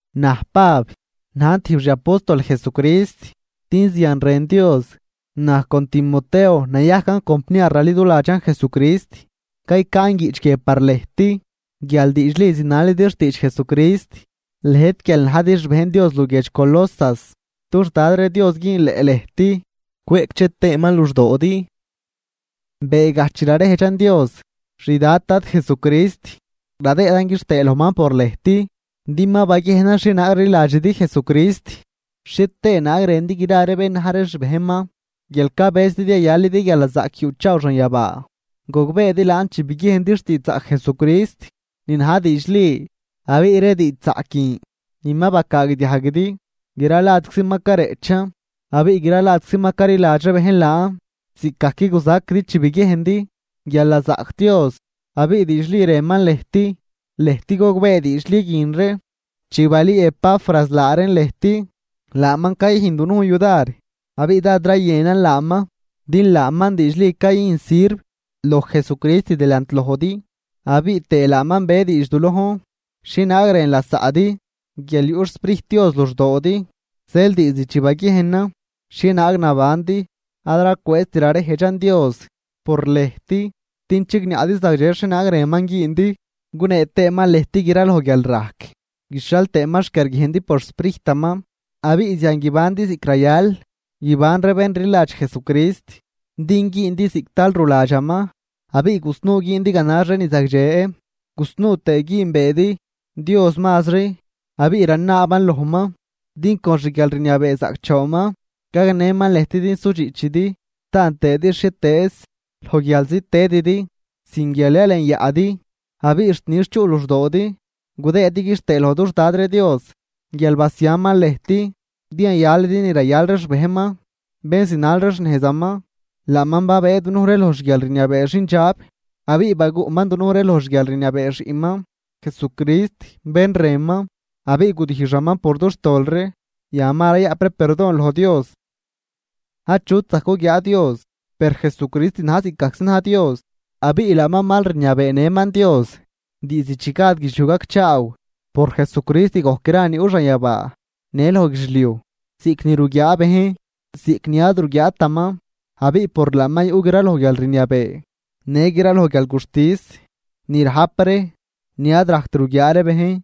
Naj Pab, najn tijb xi apóstol Jesucrist, din zian rën Dios. Naj con Timoteo nayajcan compniar raliduladxan Jesucrist, caycaan guiꞌch guie par lëjt guial diidxli zinalidi xtiidx Jesucrist, lëjt guial najdi xbejn Dios luguiedx Colosas. Dux Dad ree Dios güünleꞌ lëjt cweꞌcdxe tëëman luxdoodi. Beegaj chi rarejdxan Dios, xDad Dad Jesucrist, radëëdan quixtëë lojman por lëjt. Din ma baguiejnan xhienaag rliladxidi Jesucrist xhie tëë naag rëndi gra ree bén na̱j ree xbejnman. Guial cabëzidi yayalidi guialnazaꞌc yuꞌchaaw xanyabaa. Gogbeedi laan chi biguiejndi xtiidxzaꞌc Jesucrist ni na̱j diidxli. Abiꞌ ree diidxzaꞌc guin ni ma bacaagdiajguidi, gra ladczi ma careꞌchan. Abiꞌ gra ladczi ma caliladx ree bejn laan ziꞌcgajc guzaquidi chi biguiejndi guial nazaꞌc Dios abiꞌ diidxli rënman lëjt. Lëjt gogbee diidxli guin ree chi balüü Epafras laa reen lëjt. Laaman cayüjn dunujn yudar abiꞌ dád rayënan laaman, din laaman diidxli cayüjn sirv loj Jesucrist delant lojdi. Abiꞌ tëë laaman be diidx du lojn xhienaag rën lasaꞌdi guial yuꞌ xSprijt Dios luxdoodi. Zeel diizd chi baguiejnan xhienaag nabandi, ad racwëëzt rarejdxan Dios por lëjt din chigniaꞌdi zagdxe xhienaag rënman güündi gunee tëëman lëjt gra loj guialrajc guixhial tëëman xquiarguiejndi por xSprijtaman. Abiꞌ zian guibandi ziꞌc rayal guiban ree bén rliladx Jesucrist, din güündi ziꞌc tal ruladxaman abiꞌ gusnuu güündi ganax ree ni zagdxe gusnuu tëë güünbeedi Dios mazri. Abiꞌ ranaaban lojman din con xguialrniabee zaꞌcdxoonman gagnëman lëjt din sudxiꞌchidi, taan tëëdi xhietëëz loj guialzi tëdidi sin guial yalenyaꞌdi. Abiꞌ xt nix chuꞌ luxdoodi gudëëdi quixtëë loj dux Dad ree Dios guial basiaman lëjt din yayalidi ni rayal ree xbejnman, bén zinal ree xnejzaman. Laaman babëë dunuj ree loj xguialrniabee xindxab abiꞌ baguꞌman dunuj ree loj xguialrniabee xiꞌnman Jesucrist bén rënman, abiꞌ gudijxaman por dux tol ree, yan ma rayaꞌp ree perdon loj Dios. Achut zajc guguiaa Dios, per Jesucrist na̱j ziꞌc gajczi na̱j Dios. Abiꞌ laaman mal rniabeenëman Dios diizd chi gad guidxliuj gacchaaw. Por Jesucrist gojc gra ni yuꞌ xanyabaa në loj guidxliuj, ziꞌc ni ruguiaa bejn ziꞌc ni ad ruguiaataman. Abiꞌ por laaman yuꞌ graloj guialrniabee në graloj guialguxtis ni rajp ree ni ad rajct ruguiaa ree bejn.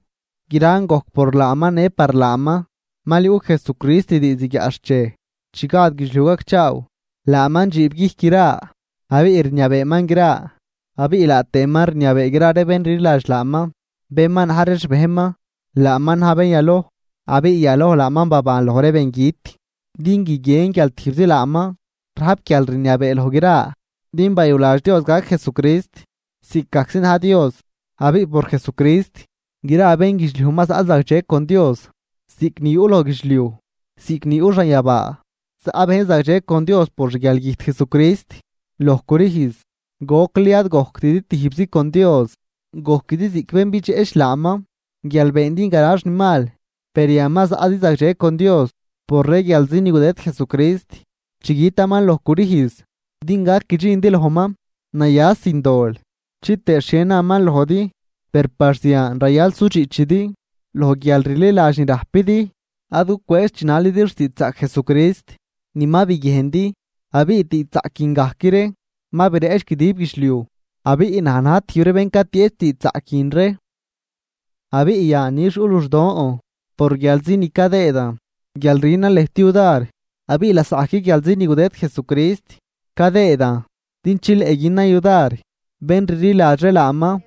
Gran gojc por laaman në par laaman. Mal yuꞌ Jesucrist diizd guiaꞌxchej chi gad guidxliuj gacchaaw, laaman dxiibguijc gra abiꞌ rniabeeman gra. Abiꞌ laa tëëman rniabee gra ree bén rliladx laaman, bén ma na̱j ree xbejnman. Laaman na̱j bén yaloj abiꞌ yaloj laaman baban loj ree bengüt din guiguien guial tijbzi laaman rajp guialrniabee loj gra. Din bayuladx Dios gac Jesucrist ziꞌc gajczi na̱j Dios. Abiꞌ por Jesucrist gra bénguidxliuj ma zaꞌ zagdxe con Dios, ziꞌc ni yuꞌ loj guidxliuj ziꞌc ni yuꞌ xanyabaa. Zaꞌ bejn zagdxe con Dios por xguialgüjt Jesucrist loj crüjz. Gocli ad gojctidi tijbzi con Dios, gojquidi ziꞌc bén bidxeꞌch laaman guial beendi ganax ni mal. Per yan ma zaꞌdi zagdxe con Dios por ree guialzi ni gudëd Jesucrist chi gütaman loj crüjz din gac guidxindi lojman naya sin dol chitëë xhie naman lojdi. Per par zian rayal sudxiꞌchidi loj guialrliladx ni rajpidi, ad gucwëëz chinalidi xtiidxzaꞌc Jesucrist ni ma biguiejndi. Abiꞌ diidxzaꞌc guin gajc ree ma bireꞌch guidib guidxliuj. Abiꞌ naj na̱j tijb ree bén catieꞌch diidxzaꞌc guin ree. Abiꞌ yan nix yuꞌ luxdon por guialzi ni cadëëdan guial rünan lëjt yudar abiꞌ lasaꞌgajc guialzi ni gudëd Jesucrist cadëëdan din chileꞌ günan yudar bén rliladx ree laaman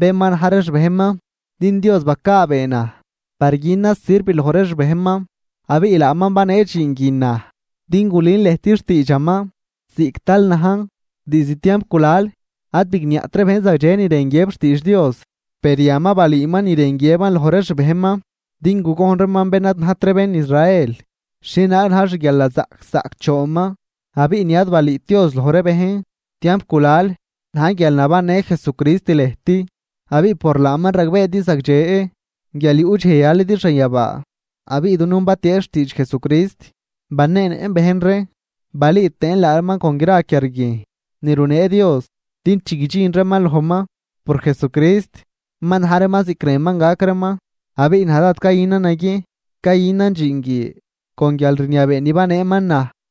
bén ma na̱j ree xbejnman. Din Dios bacaabee naj par günan sirv loj ree xbejnman. Abiꞌ laaman banee dxiin guin naj din gulün lëjt xtiidxaman ziꞌc tal najn. Diizd tiamp gulal ad bigniaꞌt ree bejn zagdxe ni rën guiëb xtiidx Dios. Per yan ma balüüman ni rën guiëban loj ree xbejnman. Din gugojn reeman bén ad najt ree bén Israel xhienaag na̱j xguialnazaꞌc zaꞌcdxoonman. Abiꞌ ni ad balüüt Dios loj ree bejn tiamp gulal na̱j guial nabannë Jesucrist lëjt abiꞌ por laaman ragbeedi zagdxe guial yuꞌ dxej yayalidi xanyabaa. Abiꞌ dunujn batieꞌch xtiidx Jesucrist, baneenëꞌn bejn ree, balüü tëën laa reeman con gra quiarguiejn ni runee Dios din chi guidxin reeman lojman por Jesucrist ma na̱j reeman ziꞌc rënman gac reeman. Abiꞌ naj dád cayünan naguiejn cayünan dxiin guie con guialrniabee ni baneeman naj.